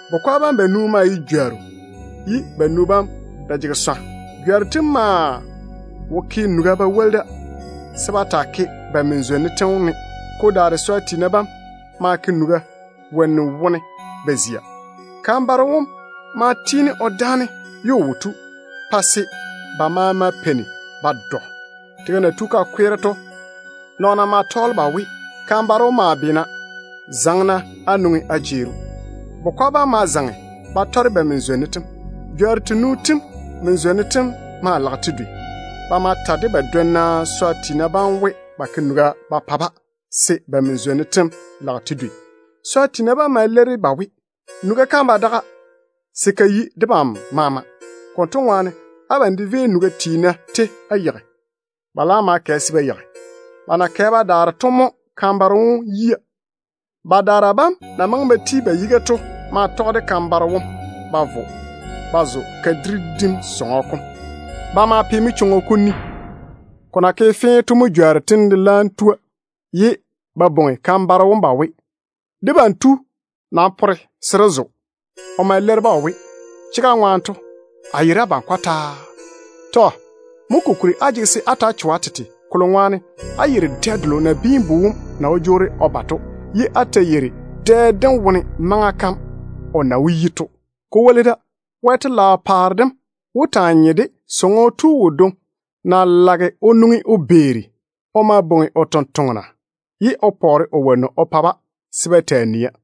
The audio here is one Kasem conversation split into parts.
Bukwa bam banu maa ye jworru, ye banu bam de jege swa. Jworru tem maa wo ke nuga ba woli da se ba taa ke ba min-zwonnu tem ne. Ko daare swa tiina bam ma ke nuga wonnu wone ba zia. Kan-baro wom ma tiini o dáane ye o wo tu, pa se ba maama peini ba dɔ. Tega na tu ka kweere to, nɔɔna ma tɔɔle ba we, ‘Kan-baro wom maa beena! Zaŋe-na á nwoŋi á jeeri‑o.’ Bukwa bam ma zaŋe ba tɔre ba min-zwonnu tem. Jworru tenu tem min-zwonnu tem maa lage te dwei. Ba ma ta de ba dwonna swa tiina bam we, ba ke nuga ba pa-ba, se ba min-zwonnu tem lage te dwei. Swa tiina bam ma leiri ba we, ‘Nuga kam ba daga se ka yi debam maama. Konto ŋwaane, abam de véi-na nuga tiina tei á yeigi.’ Ba laam ma kɛ se ba yeigi. Ba na kɛ ba daare to mo kan-baro wom yia. Badaara bam na maŋe ba ti ba yiga to ma tɔge de kan-baro wom ba vo ba zo kadiri dim sɔŋɔ kom. Ba ma pe manchwoŋo kom ni. Ko na ke fee to mo jworru tem laam tua, ye ba bwoŋi kan-baro wom ba we, ‘Debam tu, nam pore se dé zo!’ O ma leiri-ba o we, ‘Chega ŋwaane to, a nam yeiri abam kɔtaa.’ Mo kokuri á jege se á ta‑á cho á tete, kolo ŋwaane á yeiri dɛ delo Nabiin-bu wom na wó jwoori o ba to, ye á ta yeiri dɛ dem wone maŋa kam o na wó yi to. Ko woli da, Wɛ telaao paare dem wó taa nye de sɔŋɔ tu wodwoŋi na lage o nwoŋi o beeri. O ma bwoŋi o tontoŋena ye o pɔɔre o wonnu o pa-ba se ba taa nia.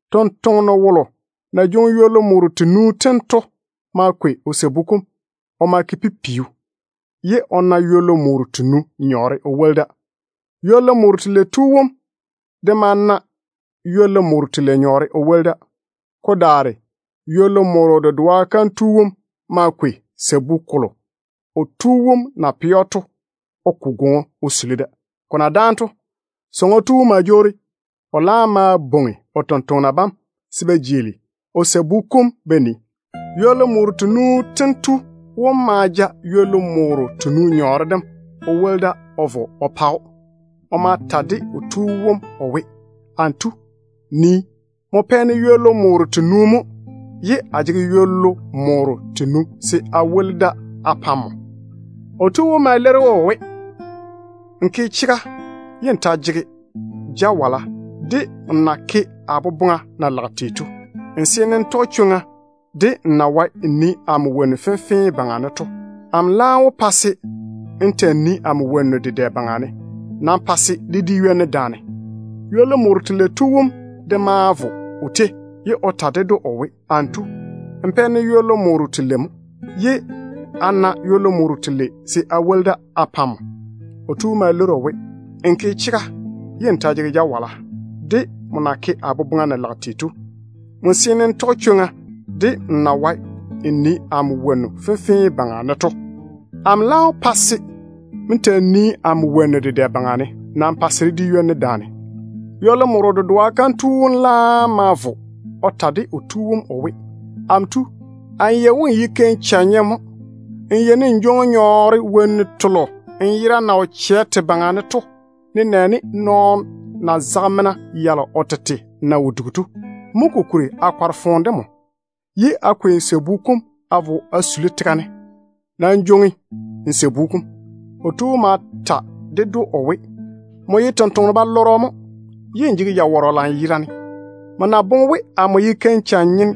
Tontoŋeno wolo na jwoŋi ywollu morro tenu tem to ma kwei o sabu kom o ma ke o pipiu, ye o na ywollu morro tenu nyɔɔre o woli da. Ywollu morro telei tu wom de ma na ywollu morro telei nyɔɔre o woli da. Ko daare ywollu moro dedoa kam tu wom ma kwei sabu kolo o tu wom na pɛ‑o to o ko gwoŋo o suli da. Ko na dáane to, sɔŋɔ tu wom ma jwoori. O laam ma bwoŋi o tontoŋena bam se ba jeeli o sabu kom ba nii. Ywollu morro tenu tu wom ma ja ywollu morro tenu nyɔɔre dem o woli da o vo o pa‑o. O ma ta de o tu wom o we, ‘Amo tu, nii. Nmo pɛ-ne ywollu morro tenu mo ye a jege ywollu morro tenu se a woli da a pa‑m.’ O tu wom ma leiri‑o o we, ‘Nmo ke chega ye n ta jege jawala de nmo na ke a boboŋa na lage tei to. Nmo seene n tɔge chwoŋa de nmo na wae n nii amo wonnu fenfee baŋa ne tei to. Amo laam wó pa se n ta‑n nii amo wonnu dedɛ baŋa ne. Nam pa se dé di ywoni daane.’ Ywollu morro telei tu wom de ma vo o tei, ye o ta ded‑o o we, ‘Amo tu, nmo pɛ-ne ywollu morro telei mo, ye a na ywollu morro telei se a woli da a pa‑m.’ O tu wom ma leiri‑o o we, ‘Nmo ke chega ye n ta jege jawala de nmo na ke a boboŋa na lage tei to. Nmo seene n tɔge chwoŋa de nmo na wae n nii amo wonnu fenfee baŋa ne tei to. Amo laam wó pa se n ta‑n nii amo wonnu dedɛ baŋa ne. Nam pa se dé di ywoni daane.’ Ywollu moro dedoa kam tu wom laam ma vo o ta de o tu wom o we, ‘Amo tu, amo yei we nmo ye keim-chɛ-nyeno mo. Nmo yeini n jwoŋi nyɔɔre wonnu telo nmo yera na wo chɛ te baŋa ne to, nenɛɛne nɔɔno na zage mena yalo o tete na wo dugi to. Mo kokuri a kɔre foone de nmo, ye a kwei nmo sabu kom a vo a suli tega ne. Nii-ko da n jwoŋi.’ O tu wom ma ta ded‑o o we, ‘Nmo ye tontoŋeno-balɔrɔ mo, ye n jege jawɔrɔ dedɛ. Nmo na boŋe we amo ye keim-chɛ-nyeno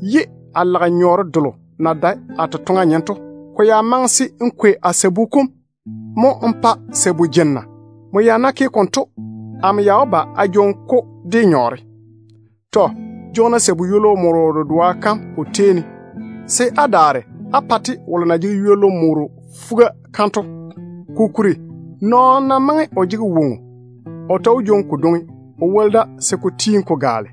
ye a lage nyɔɔre delo na dae a totoŋa nyem to, ko ya maŋe se n kwei a sabu kom mo n pa sabu jenna. Nmo ya ná ke konto, amo ya wó ba a jwoŋi-ko de nyɔɔre. Nam jwoŋi-na sabu ywollu moro dedoa kam o tei ne, se á daare á kwei-te á pa wolo na jege ywollu morro fuga kam to. Kokuri, nɔɔno ná maŋe o jege woŋo, o ta wó jwoŋi kodwoŋi o woli da se ko tiini ko gaale.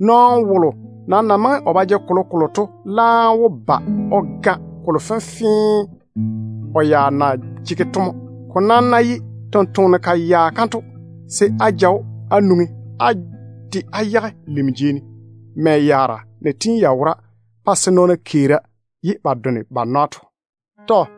Nɔɔno wolo nam na maŋe o ba jege kolokolo to laam wó ba o ga kolo fenfee o ya na jege to mo. Ko nam ná ye tontoŋeno-kayaa kanto, se á ja‑o á nwoŋi á de á yage lim jei ne, mɛ yaara na tiini ya wora pa se nɔɔna keeri ye ba done ba nwa to.’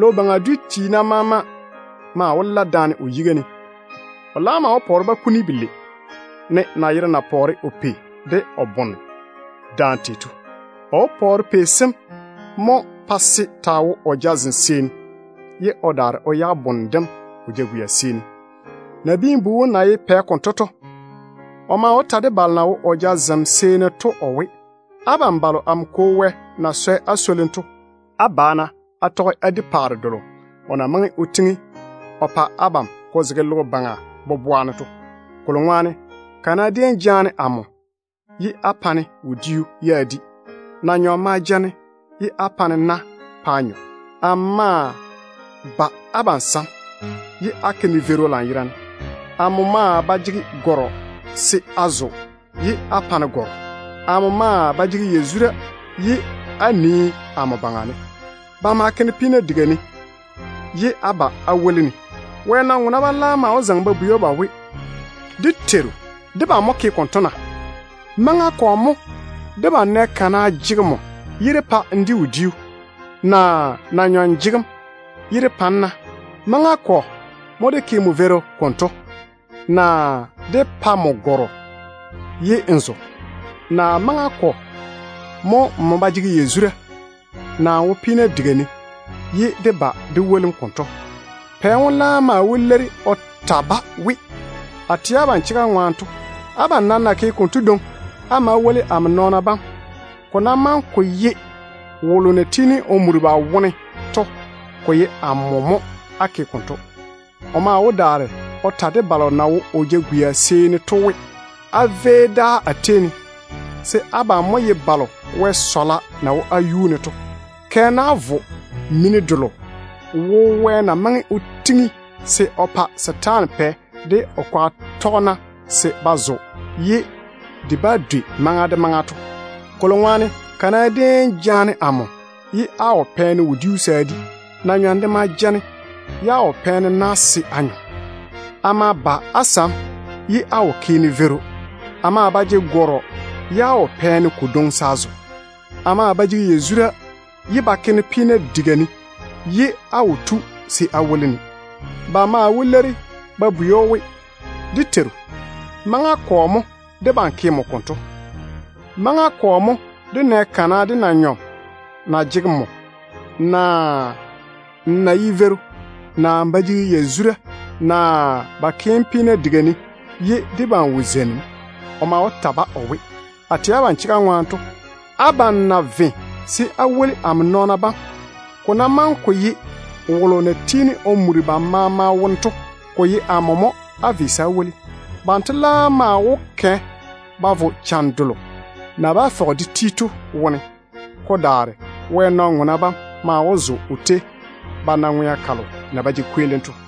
Logo baŋa dwi tiina maama maa wó la daane o yiga ne. O laam maa wó pɔɔre-ba kuni belei, ne nayero na pɔɔre o pei de o bone daane tei to. O wó pɔɔre pei sem mo pa se taa wo o jazem seeni, ye o daare o yage bone dem o jagwia seeni. Nabiin-bu wom na ye Pɛ konto to, o maa wó ta de balo na wo o jazem seeni to o we, ‘Abam balo amo Kwo Wɛ na swɛ á swolim to, á ba-na á tɔge á di paare delo o na maŋe o tiŋi o pa abam ko zege logo baŋa boboa ne to. Kolo ŋwaane, kana déem jaane amo ye á pa-ne wodiu ye a di. Na-nyɔm ma ja-ne ye á kwei na á teini-ne. Amo ma ba abam sam ye á ke-ne veiru lanyerane. A maa ba jege gɔrɔ se a zo ye á pa-ne gɔrɔ. A maa ba jege yazura ye á nii amo baŋa ne. Ba ma ke-ne peena diga ne ye á ba á woli-ne.’ Wɛ nɔn-ŋona bam laam wó zaŋe ba bwei‑o ba we, ‘Dé Teiru, debam mo ke konto na? Maŋa kɔ mo debam nɛ kana jege nmo ye dé pa n di wodiu, naa na-nyɔm jege‑m ye dé pa‑m na? Maŋa kɔ mo dé ke nmo veiru konto, naa dé pa nmo gɔrɔ ye n zo, naa maŋa kɔ mo nmo ba jege yazura, naa n wo peena diga ne ye dé ba dé woli‑m konto?’ Pɛ wom laam maa wó leiri o ta-ba we, ‘A tɛ abam chega ŋwaane to, abam na ke konto dwoŋi á ma á woli amo nɔɔna bam to, ko ná maŋe ko ye wolo na tiini o muri ba maama wone to de, ko ye amo mo á ke konto.’ O maa wó daare o ta de balo na wo o jagwia seeni to we, ‘Véi-na dáa a tei ne, se abam mo ye balo Wɛ sɔɔlem na wo á baŋa ne to. Kɛ-na á vo mini delo wo Wɛ na maŋe o tiŋi se o pa setaana pɛ de o kwaga tɔgena se ba zo ye de bá dwei maŋa de maŋa to. Kolo ŋwaane, kana déem jaane amo ye á wo pɛ-ne wodiu se a di. Na-nyɔm de ma ja-ne ye á wo pɛ-ne na se a nyɔ. A ma ba á sam ye á wo ke-ne veiru. A maa ba jege gɔrɔ ye á wo pɛ-ne kodwoŋi se a zo. A maa ba jege yazura ye ba ta ke-ne peena diga ne, ye á wo tu se á woli-ne.’ Ba maa wó leiri ba bwei‑o we, ‘Dé Teiru, maŋa kɔ mo debam ke nmo konto? Maŋa kɔ mo dé nɛ kana de na-nyɔm na jege nmo, naa n na ye veiru, naa n ba jege yazura, naa ba ke‑m peena diga ne, ye dé wo tu dé zeini‑m?’ O maa wó ta-ba o we, ‘A tɛ abam chega ŋwaane to, abam na ve se á woli amo nɔɔna bam, ko ná maŋe ko ye wolo na tiini o muri ba maama wone to de, ko ye amo mo á ve se á woli.’ Banto laam maa wó kɛ ba vo cham delo na bá fɔge de ti to wone. Ko daare Wɛ nɔn-ŋona bam maa wó zo o tei ba na ŋwea kalo na ba jege kweelim to.”